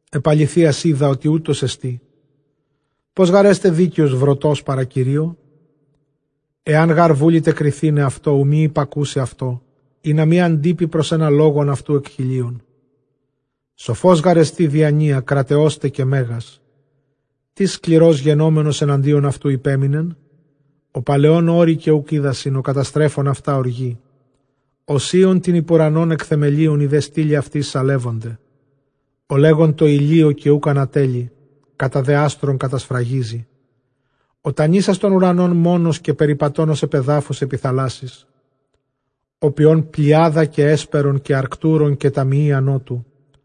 Ἐπʼ ἀληθείας οἶδα, ὅτι οὕτως ἐστί· πῶς γὰρ ἔσται δίκαιος βροτὸς παρὰ Κυρίῳ; Ἐὰν γὰρ βούληται κριθῆναι αὐτῷ, οὐ μὴ ὑπακούσῃ αὐτῷ, ἵνα μὴ ἀντείπῃ πρὸς ἕνα λόγον αὐτοῦ ἐκ χιλίων. Σοφὸς γάρ ἐστι διανοίᾳ, κραταιός τε καὶ μέγας· τίς σκληρὸς γενόμενος ἐναντίον αὐτοῦ ὑπέμεινεν; Ὁ παλαιῶν ὄρη καὶ οὐκ οἴδασιν, ὁ καταστρέφων αὐτὰ ὀργῇ· Ὁ σείων τὴν ὑπʼ οὐρανὸν ἐκ θεμελίων, οἱ δὲ στύλοι αὐτῆς σαλεύονται· Ὁ λέγων τῷ ἡλίῳ καὶ οὐκ ἀνατέλλει, κατὰ δὲ ἄστρων κατασφραγίζει· Ὁ τανύσας τὸν οὐρανὸν μόνος, καὶ περιπατῶν ὡς ἐπʼ ἐδάφους ἐπὶ θαλάσσης· Ὁ ποιῶν Πλειάδα καὶ Ἕσπερον καὶ Ἀρκτοῦρον, καὶ ταμεῖα Νότου·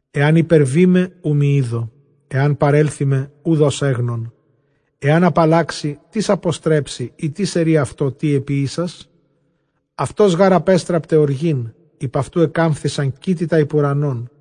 Ἐὰν ὑπερβῇ με, οὐ μὴ ἴδω· ἐὰν παρέλθῃ με, οὐδʼ ὡς ἔγνων. Ἐὰν ἀπαλλάξῃ, τίς ἀποστρέψει; ἢ τίς ἐρεῖ αὐτῷ, τί ἐποίησας; Αὐτὸς γὰρ ἀπέστραπται ὀργὴν, ὑπʼ αὐτοῦ ἐκάμφθησαν κήτη τὰ ὑπʼ οὐρανόν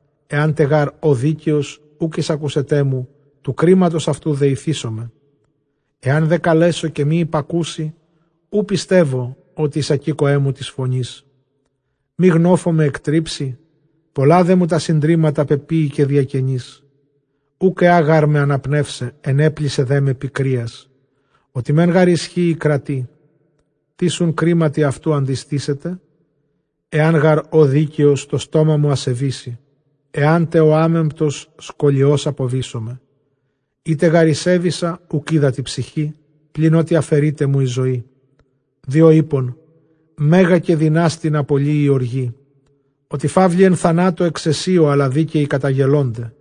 Ἐὰν γὰρ ὦ δίκαιος, οὐκ εἰσακούσεταί μου, τοῦ κρίματος αὐτοῦ δεηθήσομαι· Ἐάν τε καλέσω καὶ μὴ ὑπακούσῃ, οὐ πιστεύω ὅτι εἰσακήκοέ μου τῆς φωνῆς. Μὴ γνόφῳ με ἐκτρίψῃ· πολλὰ δέ μου τὰ συντρίμματα πεποίηκε διακενῆς. Οὐκ ἐᾷ γάρ με ἀναπνεῦσαι· ἐνέπλησε δέ με πικρίας, ὅτι μὲν γὰρ ἰσχύει κράτει· τίς οὖν κρίματι αὐτοῦ ἀντιστήσεται; Ἐὰν γὰρ ὦ δίκαιος, τὸ στόμα μου ἀσεβήσει· ἐάν τε ᾧ ἄμεμπτος, σκολιὸς ἀποβήσομαι. Εἴτε γὰρ ἠσέβησα, οὐκ οἶδα τῇ ψυχῇ, πλὴν ἀφαιρεῖταί μου ἡ ζωή. Διὸ εἶπον, μέγαν καὶ δυνάστην ἀπολλύει ὀργή, ὅτι φαῦλοι ἐν θανάτῳ ἐξαισίῳ, ἀλλὰ δίκαιοι καταγελῶνται,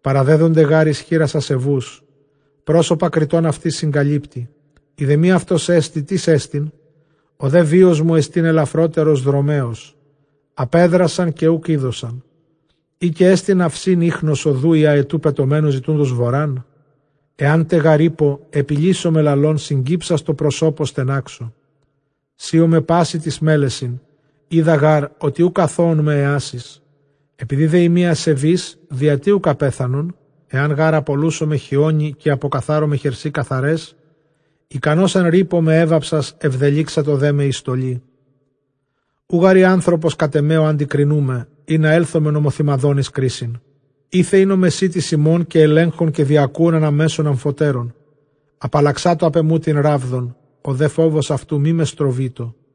παραδέδονται γὰρ εἰς χεῖρας ἀσεβοῦς, πρόσωπα κριτῶν αὐτῆς συγκαλύπτει· εἰ δὲ μὴ αὐτός ἐστι, τίς ἐστιν; Ὁ δὲ βίος μου ἐστὶν ἐλαφρότερος δρομέως· ἀπέδρασαν, καὶ οὐκ εἴδοσαν. Ἢ καὶ ἐστι ναυσὶν ἴχνος ὁδοῦ, ἢ ἀετοῦ πετομένου ζητοῦντος βοράν; Ἐάν τε γὰρ εἶπω, ἐπιλήσομαι λαλῶν, συγκύψας τῷ προσώπῳ στενάξω· Σείομαι πᾶσι τοῖς μέλεσιν, οἴδα γὰρ ὅτι οὐκ ἀθῶόν με ἐάσεις. Ἐπειδὴ δέ εἰμι ἀσεβὴς, διὰ τί οὐκ ἀπέθανον; Ἐὰν γὰρ ἀπολούσωμαι χιόνι, καὶ ἀποκαθάρωμαι χερσὶ καθαραῖς, ἱκανῶς ἐν ῥύπῳ με ἔβαψας, ἐβδελύξατο δέ με ἡ στολή. Οὐ γὰρ εἰ ἄνθρωπος κατʼ ἐμὲ, ᾧ ἀντικρινοῦμαι, ἵνα ἔλθωμεν ὁμοθυμαδὸν εἰς κρίσιν. Εἴθε ἦν ὁ μεσίτης ἡμῶν, καὶ ἐλέγχων, καὶ διακούων ἀναμέσον ἀμφοτέρων. Ἀπαλλαξάτω ἀπʼ ἐμοῦ τὴν ῥάβδον, ὁ δὲ φόβος αὐτοῦ μή με στροβείτω,